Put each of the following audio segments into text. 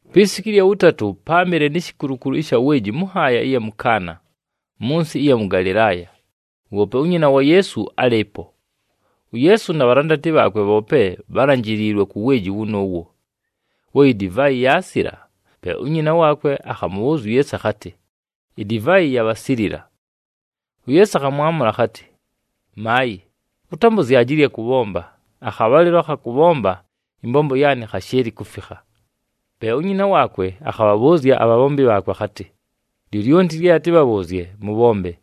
Pi siku ɨlya wʉtatʉ, páamɨle ni shikulukulu ɨsha weeji mʉ nhaaya ɨya mʉ Kaana, mʉ nsɨ ɨya Galɨlaaya. Woope unyina wa Yeesu álɨɨpo. UYeesu na bhalandati bhaakwe bhoope bhálanjiliilwe ku weeji wʉnʉʉwo. We idivaayi yaasila, pe unyina waakwe akhamʉbhʉʉzya uYeesu akhatɨ, “Idivaayi yabhasilila.” UYeesu akhamwamʉla akhatɨ, “Maayɨ ʉtambʉzyaje ɨlya kʉbhomba, akhabhalɨlo akha kʉbhomba ɨmbombo yaanɨ khashɨɨlɨ kufikha.” Pe unyina waakwe akhabhabhʉʉzya abhabhombi akhatɨ, “Lyolyonti lye atɨbhabhʉʉzye, mʉbhombe.”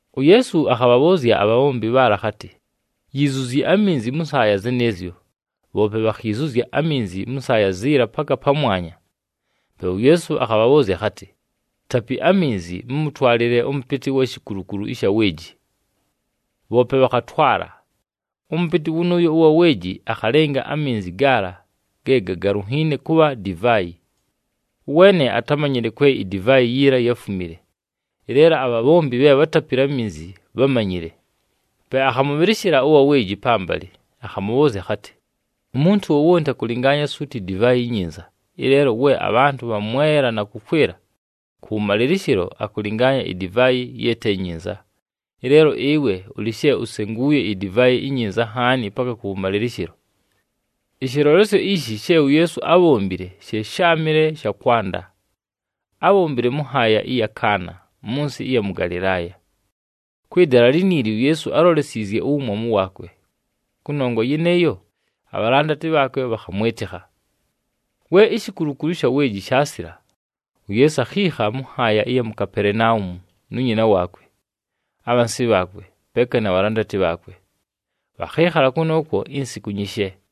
UYeesu akhabhabhʉʉzya abhabhombi bhaala akhatɨ, “Yiizuzyi aminzi mʉ nsaaya zɨnɨɨzyo.” Bhoope bhakhiizuzya aminzi mʉ nsaaya ziila paka pamwanya. Pe uYeesu akhabhabhʉʉzya akhatɨ, “Tapi aminzi, mʉmʉtwalɨle ʉmʉpɨtɨ ʉwa shikulukulu ɨsha weeji.” Bhoope bhakhatwala. Ʉmʉpɨtɨ wʉnʉʉyo ʉwa weeji akhalɨnga aminzi gaala ge gagalunhiine kʉbha divaayi. Ʉweene atámanyile kwe idivaayi yiila yáfumile, ɨleelo abhabhombi bhe bhátapile aminzi bhámanyile. Pe akhamʉbhɨlɨshɨla ʉwa weeji pambalɨ, akhamʉbhʉʉzya akhatɨ, “Umuntu wowonti akʉlɨngaanya suuti idivaayi inyinza, ɨleelo we abhantʉ bhamwela na kʉkwɨla, kʉwʉmalɨlɨshɨlo akʉlɨngaanya idivaayi ye te nyinza. Ɨleelo ɨwe ʉlɨ she usenguuye idivaayi inyinza nhaani paka kʉwʉmalɨlɨshɨlo.” Ɨshɨlolesyo ishi she uYeesu ábhombile she sháamɨle sha kwanda. Ábhombile mʉ nhaaya ɨya mʉ Kaana, mʉ nsɨ ɨya mʉ Galɨlaaya. Kwɨ dala liniili uYeesu álolesiizye uwumwamu waakwe. Kʉnongwa yɨnɨɨyo, abhalandati bhaakwe bhakhamwɨtɨkha. We ishikulukulu ɨsha weeji shaasila, uYeesu akhiikha mʉ nhaaya ɨya mu Kapelenaumu nu nyina waakwe, abhansi bhaakwe, peeka na bhalandati bhaakwe. Bhakhɨɨkhala kʉnʉʉkwo insiku nyishe.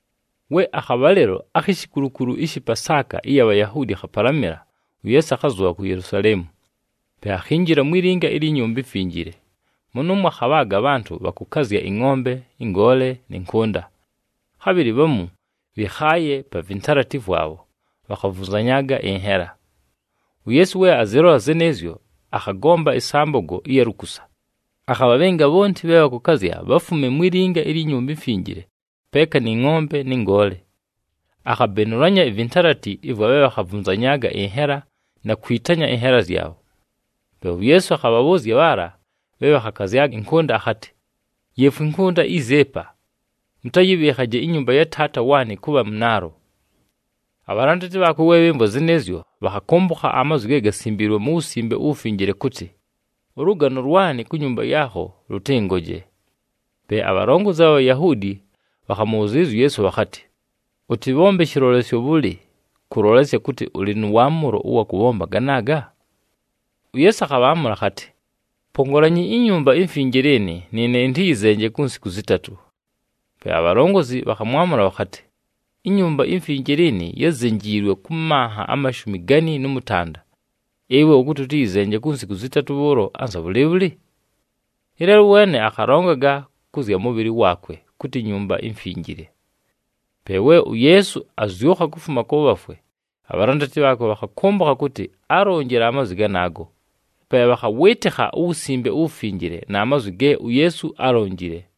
We akhabhalɨlo akhi shikulukulu ɨshɨ Pasaaka ɨya Bhayahuudi khapalamɨla, uYeesu akhazʉbha ku Yelusaleemu. Pe akhinjila mwi linga ilyi Nyumba iMfinjile. Mʉnʉʉmwo akhabhaaga abhantʉ bhakʉkazya ɨngʼombe, ɨngoole, nɨ nkʉnda. Khabhɨlɨ bhamu bhɨkhaaye pa vintalati vwabho bhakhavunzanyaaga ɨnhela. UYeesu we azɨlola zɨnɨɨzyo, akhagomba ɨsambogo ɨya lukusa, akhabhabhɨnga bhonti bhe bhakʉkazya bhafume mwi linga ilyi Nyumba iMfinjile peeka nɨ ngʼombe nɨ ngoole. Akhabenulanya ivintalati ɨvwa bhe bhakhavunzanyaaga ɨnhela na kwitanya ɨnhela zyabho. Pe uYeesu akhabhabhʉʉzya bhaala bhe bhakhakazyaga ɨnkʉnda akhatɨ, “Yeefwi ɨnkʉnda izi ɨpa! Mʉtayɨbhɨɨkhaje inyumba ya Taata waanɨ kʉbha mʉnaalo.” Abhalandati bhaakwe we bhɨmvwa zɨnɨɨzyo, bhakhakʉmbʉkha amazwi ge gasimbiilwe mu Wusimbe uWufinjile kʉtɨ, “Ʉlʉgano lwanɨ ku nyumba yaakho lʉtɨngoje.” Pe abhalongozi abha Bhayahuudi bhakhamʉbhʉzɨɨlɨzya uYeesu bhakhatɨ, “Ʉtɨbhombe shɨlolesyo bhʉlɨ kʉlolesya kʉtɨ ʉlɨ nʉ waamʉlo ʉwa kʉbhomba ganaaga?” UYeesu akhabhaamʉla akhatɨ, “Pongolanyi iNyumba iMfinjile ɨnɨ, nɨɨne ɨntɨyɨzenje ku nsiku zɨtatʉ.” Pe abhalongozi bhakhamwamʉla bhakhatɨ, “INyumba iMfinjile ɨnɨ yázenjiilwe kʉ manha amashumi gani nʉ mʉtanda. Ɨwe ʉkʉtɨ ʉtɨyɨzenje ku nsiku zɨtatʉ bhʉʉlo anza bhʉlɨɨbhʉlɨ?” Ɨleelo ʉweene akhalongaga kʉ zya mʉbhɨlɨ waakwe kʉtɨ Nyumba iMfinjile. Pe we uYeesu azyʉkha kufuma kʉ bhafwe, abhalandati bhaakwe bhakhakʉmbʉkha kʉtɨ álonjile amazwi ganaago. Pe bhakhawɨɨtɨkha uWusimbe uWufinjile na mazwi ge uYeesu álonjile.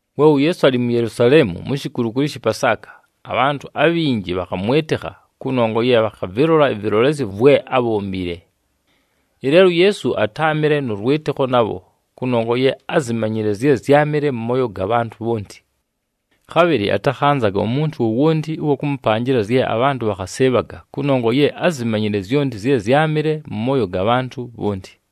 We uYeesu alɨ mu Yelusaleemu mu shikulukulu ɨshɨ Pasaaka, abhantʉ abhinji bhakhamwɨtɨkha kʉnongwa ye bhakhavɨlola ɨvɨlolesyo vwe ábhombile. Ɨleelo uYeesu atáamɨle nʉ lwɨtɨkho nabho kʉnongwa ye ázimanyile zye zyámɨle mʉ mooyo ga bhantʉ bhonti. Khabhɨlɨ atakhanzaga umuntu wowonti ʉwa kʉmʉpanjɨla zye abhantʉ bhakhasɨɨbhaga kʉnongwa ye ázimanyile zyonti zye zyámɨle mʉ mooyo ga bhantʉ bhonti.